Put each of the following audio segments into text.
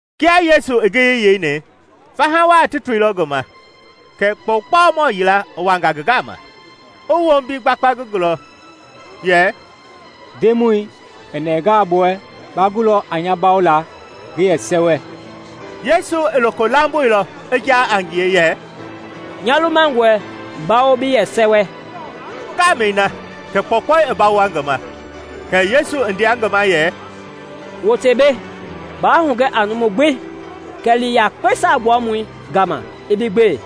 Kia Yesu i ngiyei yeini, faha wa ti toilɔ ngi ma. Kɛ kpɔukpɔumɔ yila i wanga ngi gama, i wombi gbakpa ngi gɔɔbu yɛ, “Ndemɔi, i nɛngalɔ bi wɛ, ba gulɔ a nya bawola ngi yɛ sɛwɛ.” Yesu i loko lamboilɔ i jaa a ngie yɛ, “Nya lumangɔe, bawo bi yɛ sɛwɛ.” Ngaamɛi na kɛ kpɔukpɔui i bawoa ngi ma. Kɛ Yesu i ndea ngi ma yɛ, “Wote mbei! Baa hugɛ a numu gbi, kɛɛ li yakpe Saagbuamɔi gama i bi gbe;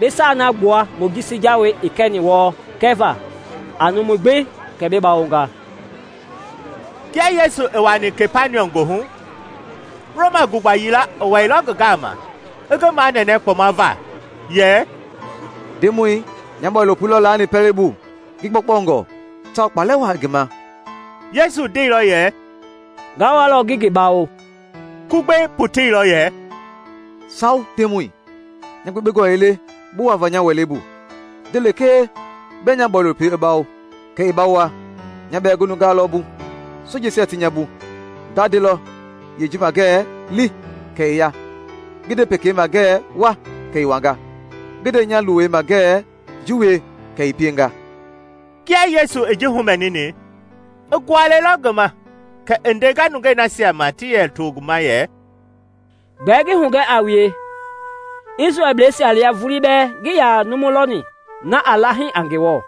bi saa na gbua Mojisi jawei i kɛni wɔɔ kɛva a numui gbi kɛ bi bawonga.” Kia Yesu i wuani Kapaniɔm goohu, Roma gugba yila i wɛilɔ ngi gama ngi manɛnɛ kpɔma va yɛ, “Ndemɔi, nya bɔilopoi lɔ laani pɛlei bu ngi gbɔkpɔngɔ tawao kpaalɛ waa i ngi ma.” Yesu ndeilɔ yɛ, “Nga walɔ ngi ngi bawo.” Kugbei poteilɔ yɛ, “Sawo, Ndemɔi, nya gbekpengɔ ii le bi wuava nya wɛlei bu. Nde lekee bɛɛ nya bɔilopoi i bawo, kɛ i bawoa. Nya bɛɛ ngi nuungaa lɔ bu, sojeisia ti nya bu. Nga ndelɔ yeeji ma ngɛɛ ‘Li!’ kɛ i ya; ngi nde pekei ma ngɛɛ ‘Wa!’ kɛ i wanga; ngi nde nya luwei ma ngɛɛ ‘Ji wie!’ kɛ i pienga.” Kia Yesu i ji humɛnini, i gualɛilɔ ngi ma kɛ i ndenga nungei nasia ma ti yɛ to ngi ma yɛ, “Gbɛɛ ngi hugɛ a wue, Isrɛlblɛisia lia vulii bɛɛ ngii yaa numu lɔni na aa la hii a Ngewɔ.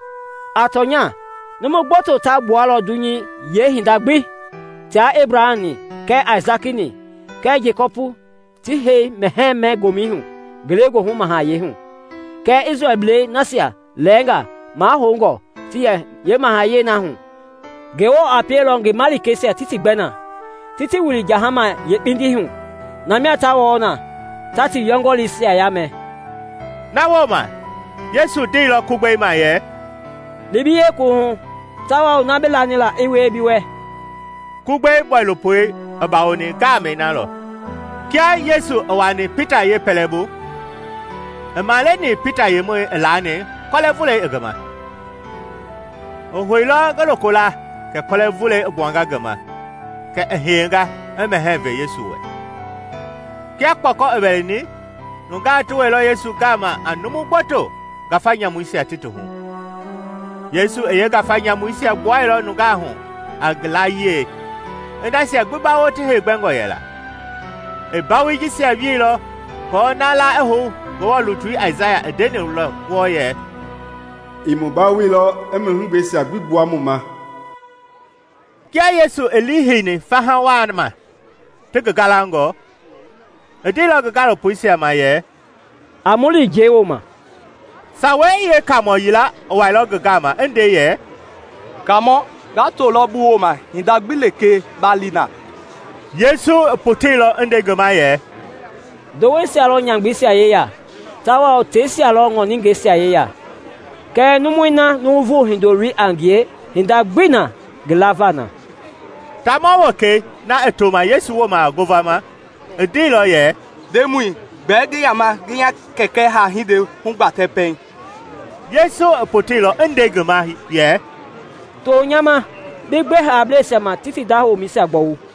A tɔnya, numu gboto ta gbualɔ dunyei yeehinda gbi tia Ebraham-ni kɛɛ Aisaki kɛɛ Jekɔpi ti hei mɛhɛɛ-mɛ-gomɛi hu ngelegoohu mahayɛi hu, Kɛɛ Isrɛlblei nasia lɛɛnga mahoungɔ ti yɛ yeemahayɛi na hu Ngewɔ a pielɔ ngi malikeisia ti ti gbɛ na, ti ti wili jahama yeekpindii hu, na mia ta wɔɔ na, ta ti yɔngɔlii yaamɛ.” Na wooma Yesu ndeilɔ Kugbei ma yɛ, “Li bi yeekuwuhu, tawao na bi lani la i wie bi wɛ.” Kugbei bɔilopoi i bawoni ngaamɛi na lɔ. Kia Yesu i wuaani Pita yee pɛlɛbu, i maleni Pita yemɔi i laani kɔlɛ vulɛi i ngi ma. I houilɔ ngi lokola kɛ kɔlɛ vulɛi i gbuanga ngi ma, kɛ i hiyenga i mɛhɛɛ vɛ Yesu wɛ. Kia kpɔkɔ i wɛlɛni, nungaa ti wɛilɔ Yesu gama a numu gboto ngafa nyamuisia ti ti hu. Yesu i yeengafa nyamuisia gbuailɔ nungaa hu a ngi layie, i nasia gbi bawo ti heegbɛngɔ yɛla. I mbawoi jisia wieilɔ aako na la i hou Ngewɔ lutui Aisaya i ndeni wɔɔ yɛ, “I mu bawoilɔ i mu heegbɛisia gbi gbua mu ma.” Kia Yesu i liiheini faha waa ma ti ngi gaalangɔ, i ndeilɔ ngi gaalopoisia ma yɛ, “A mu li njɛi wooma.” Sawei Yeekamɔɔ yila i wailɔ ngi gama i nde yɛ, “Kaamɔ, nga tolɔ bi wooma hinda gbi lekee ba li na.” Yesu i poteilɔ i nde ngi ma yɛ, “Ndoweisia lɔ nyamgbeisia yeya tawao teisia lɔ ŋɔningɛisia yeya; kɛɛ numui na Nuuvu Hindoloi a ngie, hinda gbii na ngi lava na.” Taamɔ wekei, na i tooma Yesu ma ngovama, i ndeilɔ yɛ, “Ndemɔi, gbɛɛ ngi yaama ngi nya kɛkɛ haa-hindei hugbatɛ pɛiŋ.” Yesu i poteilɔ yɛ ngi ma, “To nya ma, bi gbe haableisia ma ti ti da womɛisia gbɔwu.”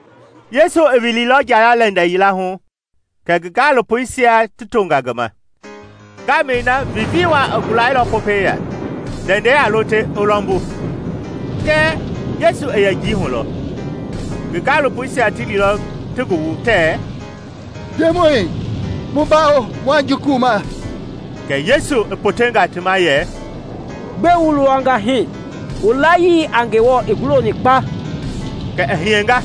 Yesu i wililɔ njaya-lɛndɛ yila hu kɛ ngi gaalopoisia ti tonga ngi ma. Ngaamɛi na vivii waa i gulailɔ Popɛi ya, ndɛndɛi a lo te i lɔmbu; kɛɛ, Yesu i yɛ njii hu lɔ. Ngi gaalopoisia ti lilɔ ti ngi wu tɛɛ, “Ndemɔi, mu bawo! Mua jukuma!” Kɛ Yesu i potenga ti ma yɛ, “Gbɛe wu luwanga hii? Wu layii a Ngewɔ i guloni kpa!” Kɛ i hiyenga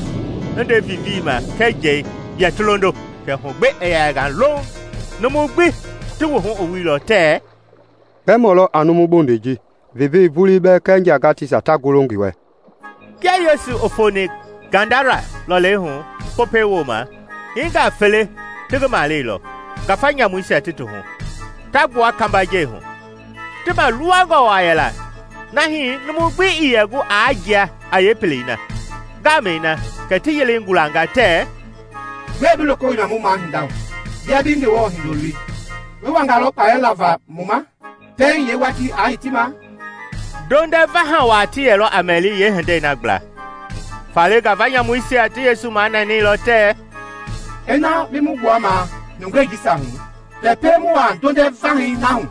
i nde vivii ma kɛɛ njɛi yɛ ti londo, kɛ hu gbi i yɛnga louŋ. Numui gbi ti wuhu i wuilɔ tɛɛ, “Gbɛ mɔ lɔ a numu bondei ji, vivii vulii bɛɛ kɛɛ njagateisia ta golo ngi wɛ?” Kia Yesu i foni Gadara lɔlei hu, Popɛi wooma, hiinga fele ti ngi maleilɔ, ngafa nyamuisia ti ti hu, ta gbua kambajɛi hu. Ti maaluwangɔ waa yɛla na hii numu gbi ii yɛ gu aa jia a yee pelei na. Ngaamɛi na kɛ ti yelei gulanga tɛɛ, “Gbɛe bi loko wilima mu mahinda hu, bia bi Ngewɔ Hindoloi? Bi wangalɔ kpaalɛ lava mu ma pɛiŋ yee watii a hitima?” Ndondɛ vaha waa ti yɛlɔ a mɛli, yee hindei na gbla. Faale ngafa nyamuisia ti Yesu manɛnɛilɔ tɛɛ, “Ina bi mu gbuamaa nungei jisia hu, kɛ pie mu wuaa ndondɛ vahɛi na hu.”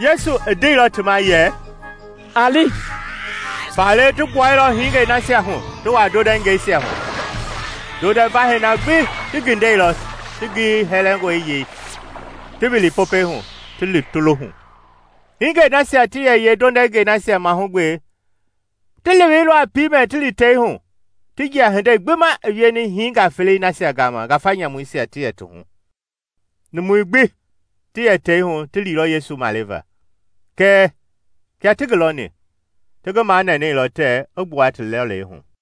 Yesu i ndeilɔ ti ma yɛ, “A li.” Faale ti gbuailɔ hingei nasia hu ti wuaa ndondɛngɛisia hu. Ndondɛ vahɛi na gbi ti gindɛilɔ ti ngiyei hɛlɛngɔi yei, ti wili Popɛi hu, ti lo hu. Hingei nasia ti yɛ yee ndondɛngɛisia mahugbe ti leweilɔ a piimɛ ti li tei hu, ti jia hindei gbi ma i wieni hiingaa felei nasia gama ngafa nyamuisia ti yɛ ti hu. Numui gbi ti yɛ tei hu ti liilɔ Yesu maleva; kɛɛ, kia ti ngi lɔni, ti ngi manɛnɛilɔ tɛɛ i gbua ti lɔlei hu.